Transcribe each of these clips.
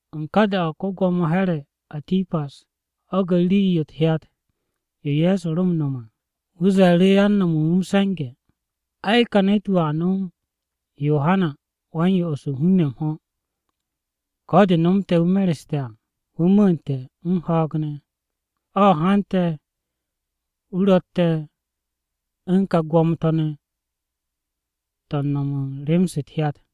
U̱n ka da-o̱, ko-Gwo̱mo Here̱ [Atipas] ho̱ge̱ rii-yo u̱t-hyat to̱ Ye̱so ro m-no̱m à. Wu̱ ze̱e̱ru̱ yan nome̱ u̱n wu̱ m-se̱nge̱, “Ai, ka ne̱t-wu̱ a nom Yohana Wa-m-Yo'os u̱n hun-ne̱ m-ho̱. Ko̱ de nomte̱ wu̱ mereste̱ à, wu̱ mu̱u̱nte̱ u̱n ho̱o̱g ne̱! O̱ hante̱ wu̱ ro̱tte̱ u̱n ka gwo̱mo-to̱ ne̱ to̱ u̱n no̱m u̱n rem-se u̱t-hyat.”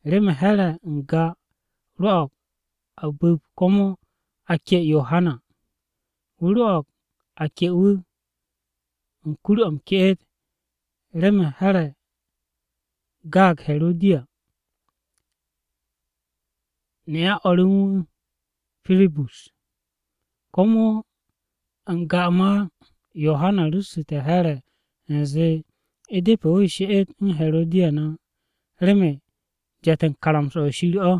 Remen Here̱ n-ga rwo̱o̱g a bu̱p komo a ke'e Yohana, wu̱ rwo̱o̱g a ke'e wu̱ o-kuke̱ o̱ m-ke'et remen Here̱ gaag Herodiya, ne'a wu̱ u̱n o̱r re u̱n wu̱, Pirip. Komo n-ga ma Yohana ru̱ssu̱te̱ Here̱ u̱nze u̱depe̱ wu̱ she'et u̱n Herodiya ne̱ á, remen jet u̱n karamsa-o̱ Shir o̱.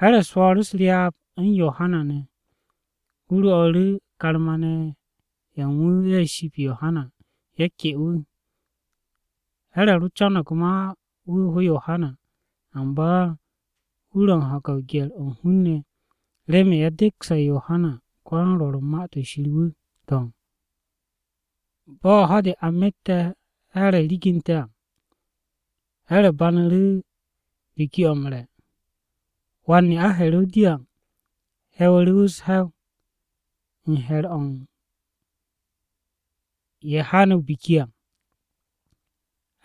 Here̱ swo̱o̱ru̱ u̱s-ryaab u̱n Yohana ne̱. Wu̱ rwo̱'u̱ru̱ karma-ne̱ ye̱ u̱n wu̱, ye̱ ship Yohana, ye̱ ke wu̱. Here̱ ro co̱no̱g ma wu̱ ho Yohana, amba wu̱ ro̱ m-ho̱ge̱ gye̱r-o̱ u̱n hun-ne̱, remen ye̱ dekse̱ Yohana ko-yan-Rwo̱r u̱n Ma-to̱ Shir wu̱. To̱, bo̱ ho̱-de a mette̱ Here̱ riginte̱ à, Here̱ banu̱ru̱ biki-o̱ m-re̱. Wan-ne'a Herodiya he̱wu̱ru̱ wu̱ u̱s-he̱w u̱n he̱r-o̱ u̱n ye̱ haane̱ o-biki à.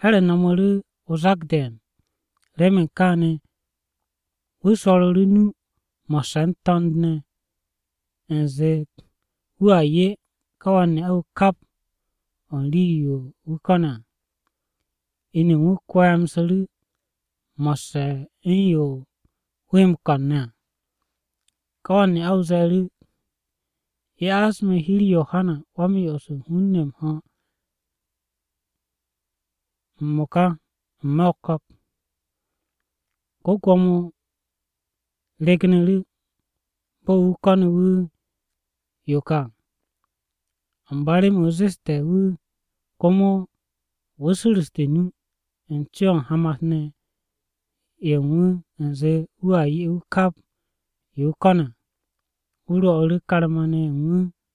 Here̱ no̱mu̱ru̱ o-zak de̱e̱n. Remen kaane̱ wu̱ swo̱ru̱ru̱ o-nu mo̱sse̱ u̱n to̱nd ne̱ u̱nze, wu̱a 'ye ka wan-ne'a-wu̱ kap o̱ u̱n rii-yo wu̱ ko̱ne̱ à. Inu u̱n wu̱ kwemsu̱ru̱ wu̱ mo̱sse̱ u̱n yo wu̱ he m-ko̱n ne̱ à. Ká wan-ne'a-wu̱ ze̱e̱ru̱, “Ya'as me̱ hi-u̱r Yohana Wa-m-Yo'os u̱n hun-ne̱ m-ho̱ m-mo̱ka n-me̱ o-ko̱k.” Ko-Gwo̱mo ryegnu̱ru̱, bo̱ wu̱ ko̱ne̱ wu̱ yo ka à. Amba remen wu̱ zeste̱ wu̱, komo wu̱ su̱ru̱ste̱ o-nu, u̱n co-o̱ u̱n hamat-ne̱ ye̱ u̱n wu̱ u̱nze wu̱a 'ye wu̱ kap yo wu̱ ko̱ne̱ à. Wu̱ rwo̱'u̱ru̱ karma-ne̱ ya'as wu̱ yo wu̱ ko̱ne̱ à.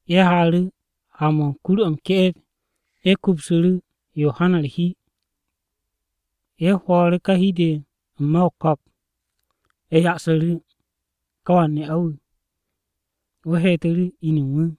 Ye̱ haaru̱ ha-mo̱ u̱n kur-o̱ m-ke'et, ye̱ kupsu̱ru̱ Yohana u̱r-hi. Ye̱ hwo̱o̱ru̱ ká hi-de n-me̱ o-ko̱k. Ye̱ ya'su̱ru̱ ká wan-ne'a-wu̱, wu̱ heetu̱ru̱ inu u̱n wu̱.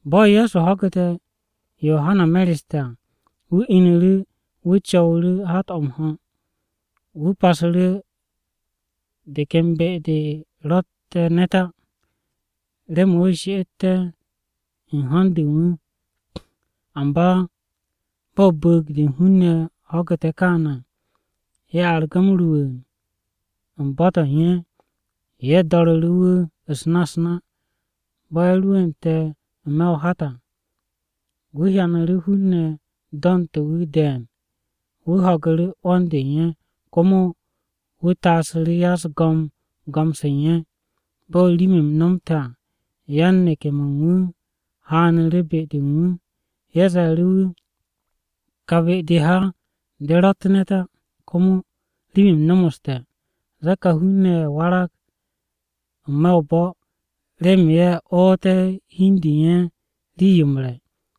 Bo̱ Ye̱so ho̱gu̱te̱ Yohana mereste̱ à, wu̱ inu̱ru̱ wu̱ co̱wu̱ru̱ hat-o̱ m-ho̱. Wu̱ pasu̱ru̱ de ken be-de de ro̱tte̱ ne̱t á, remen wu̱ she'etté̱ u̱n ho̱n-de u̱n wu̱. Amba bo̱ bu̱u̱g-de u̱n hun-ne̱ ho̱gu̱te̱ kaane̱ à, ye̱ argu̱ m-rwu̱u̱n u̱n bo̱-to̱ u̱n ye̱. Ye̱ do̱ru̱ru̱ wu̱ u̱s-na u̱s-na. Bo̱ Ye̱so rwu̱u̱nte̱ n-me̱ o-hat à, wu̱ hyanu̱ru̱ hun-ne̱ do̱nte̱ wu̱ de̱e̱n. Wu̱ ho̱gu̱ru̱ 'wo̱n-de u̱n ye̱, komo wu̱ taasu̱ru̱ ya-u̱s-go̱m go̱m-se u̱n ye̱. Bo̱ rim-m no̱mte̱ à, yan-neke̱-mo̱ u̱n wu̱ haanu̱ru̱ be-de u̱n wu̱. Ye̱ ze̱e̱ru̱ wu̱, “Kà be-de ha de ro̱tt ne̱t á, komo rim-m nomoste̱. Zee kà hun-ne̱ ye̱ warag n-me̱ o-bo̱ remen ye̱ ooté̱ hi u̱n de u̱n ye̱ rii-yo m-re̱.”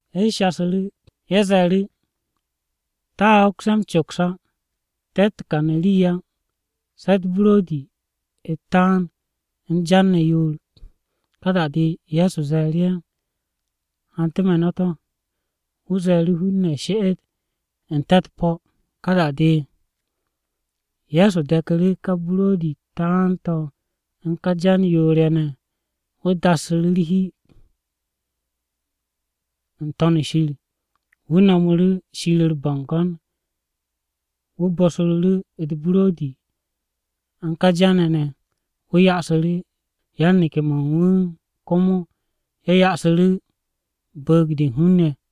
Ye̱ shasu̱ru̱, ye̱ ze̱e̱ru̱, “Te̱a hoks ye̱ m-coks á, te̱tt rii kane̱ á se̱ u̱t-buro̱di u̱t-taan u̱n jan ne̱ yoor.” Ka da-de, Ye̱so ze̱e̱ru̱ ye̱, “Hante̱ me̱ no̱ to̱.” Wu̱ ze̱e̱ru̱ hun-ne̱ she'et n-te̱ u̱t-po̱. Ka da-de Ye̱so de̱ku̱ru̱ ká buro̱di-u̱t taan-to̱ u̱n ká jan yoor-ye̱ ne̱. Wu̱ dassu̱ru̱ hi-de u̱n wu̱ n-To̱n shir. Wu̱ no̱mu̱ru̱ Shir u̱r-bo̱ngo̱n. Wu̱ bosru̱ru̱ u̱t-buro̱di u̱n ká jan-ye̱ ne̱. Wu̱ ya'asu̱ru̱ yan-neke̱-mo̱ u̱n wu̱, yan-neke̱-mo̱ u̱n wu̱ komo ye̱ ya'asu̱ru̱ bu̱u̱g-de u̱n hun-ne̱.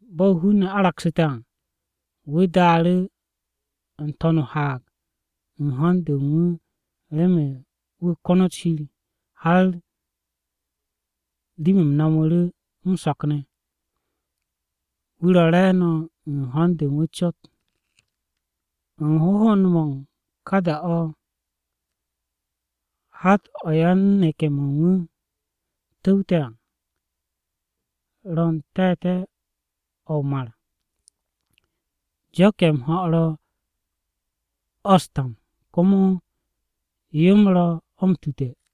Bo̱ hun-ne̱ aragsu̱te̱ à, wu̱ daaru̱ n-to̱n o-haag u̱n ho̱n-de u̱n wu̱ remen wu̱ konot Shir. Har rim-m no̱mu̱ru̱ m-so̱k ne̱ wu̱ ro̱ re̱e̱no̱ u̱n ho̱n-de u̱n wu̱ cot. U̱n hohond-mo̱ u̱n ká da-o̱ hat-o̱ yan-neke̱-mo̱ u̱n wu̱ tu̱wte̱ à ro̱ n-te̱te̱ o̱ o-mar, jo̱k-ye̱ m-ho̱ ro̱ o̱ u̱s-tam, komo yo-m ro̱ o̱ m-tute̱.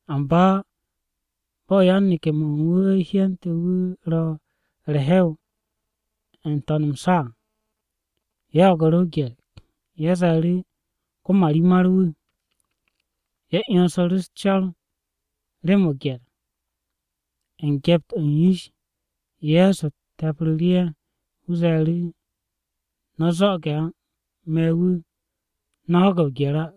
Amba bo̱ yan-neke̱-mo̱ u̱n wu̱ hyente̱ wu̱ ro̱ u̱r-hew n-to̱n m-sa à, ye̱ ho̱gu̱ru̱ o-gye̱r. Ye̱ ze̱e̱ru̱, “Ko-marimar-wu̱!” Ye̱ 'yonsu̱ru̱ u̱s-co̱r rem o-gye̱r! U̱n gyept-o̱ u̱n yish, Ye̱so te̱psu̱ru̱ ye̱, wu̱ ze̱e̱ru̱, “No̱ zo̱'o̱ge̱ á! Me̱ wu̱, no̱ ho̱ge̱ o-gye̱r á!”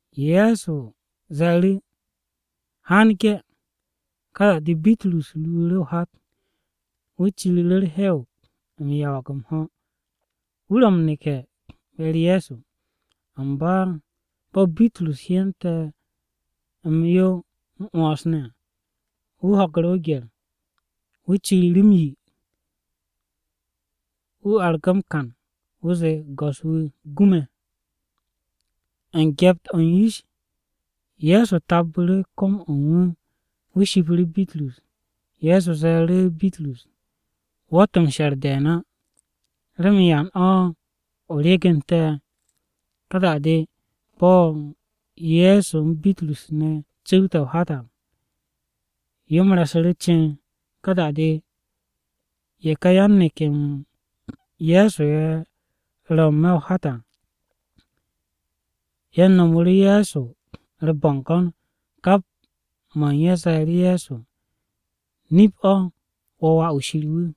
Ye̱so ze̱e̱ru̱, “Haan ge̱.” Ka da-de Bitrus ruuru̱ o-hat, wu̱ ciriru̱ u̱r-hew m-yawag m-ho̱, wu̱ ro̱ m-neke̱ be-u̱r Ye̱so. Amba bo̱ Bitrus hyente̱ m-yo m-'wo̱ns ne̱ à, wu̱ ho̱gu̱ru̱ o-gye̱r. Wu̱ ciriru̱ m-yi. Wu̱ argu̱ m-kan, wu̱ zee, “Go̱s-wu̱, gu me̱!” U̱n gyept-o̱ u̱n yish, Ye̱so tabbu̱ru̱ kom-o̱ u̱n wu̱, wu̱ shipu̱ru̱ Bitrus. Ye̱so ze̱e̱ru̱ Bitrus, “Wo̱tt m-she̱r de̱e̱n á, ¿remen yan o̱ o ryegente̱?” Ka da-de bo̱ Ye̱so u̱n Bitrus ne̱ cu̱wte̱ o-hat à, yo-m re̱su̱ru̱ ceen. Ka da-de ye̱ ka yan-neke̱-m Ye̱so ye̱ ro̱ n-me̱ o-hat à, ye̱ nomoru̱ Ye̱so u̱r-bo̱ngo̱n. Kap mo̱ u̱n ye̱ ze̱e̱ru̱ Ye̱so, “Nip-o̱, wo̱ Wà-wu̱ Shir wu̱.”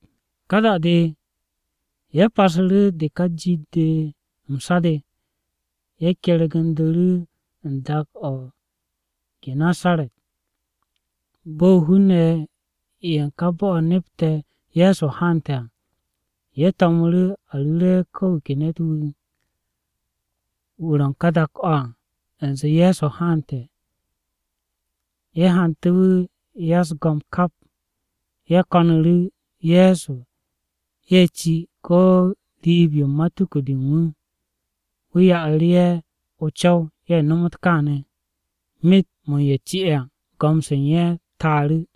Ka da-de ye̱ pasu̱ru̱ de ka jit-de m-sa de, ye̱ kergu̱ndu̱ru̱ u̱n dak-o̱ o-Genesaret. Bo̱ hun-ne̱ ye̱ u̱n ká bo̱-o̱ nepte̱ Ye̱so haante̱ à, ye̱ to̱mu̱ru̱ a ru̱re̱ ko̱ wu̱ ke ne̱t-wu̱, wu̱ ro̱ u̱n ká dak-o̱ à, u̱nze Ye̱so haante̱. Ye̱ hante̱ wu̱ ya-u̱s-go̱m kap. Ye̱ ko̱nu̱ru̱ Ye̱so ye̱ ci ko̱ riib-yo u̱n matuku-de u̱n wu̱. Wu̱ ya'u̱ru̱ ye̱ o-co̱w, ye̱ nom káane̱. Myet-mo̱ u̱n ye̱ ci'e̱ à go̱m-se u̱n ye̱ taaru̱.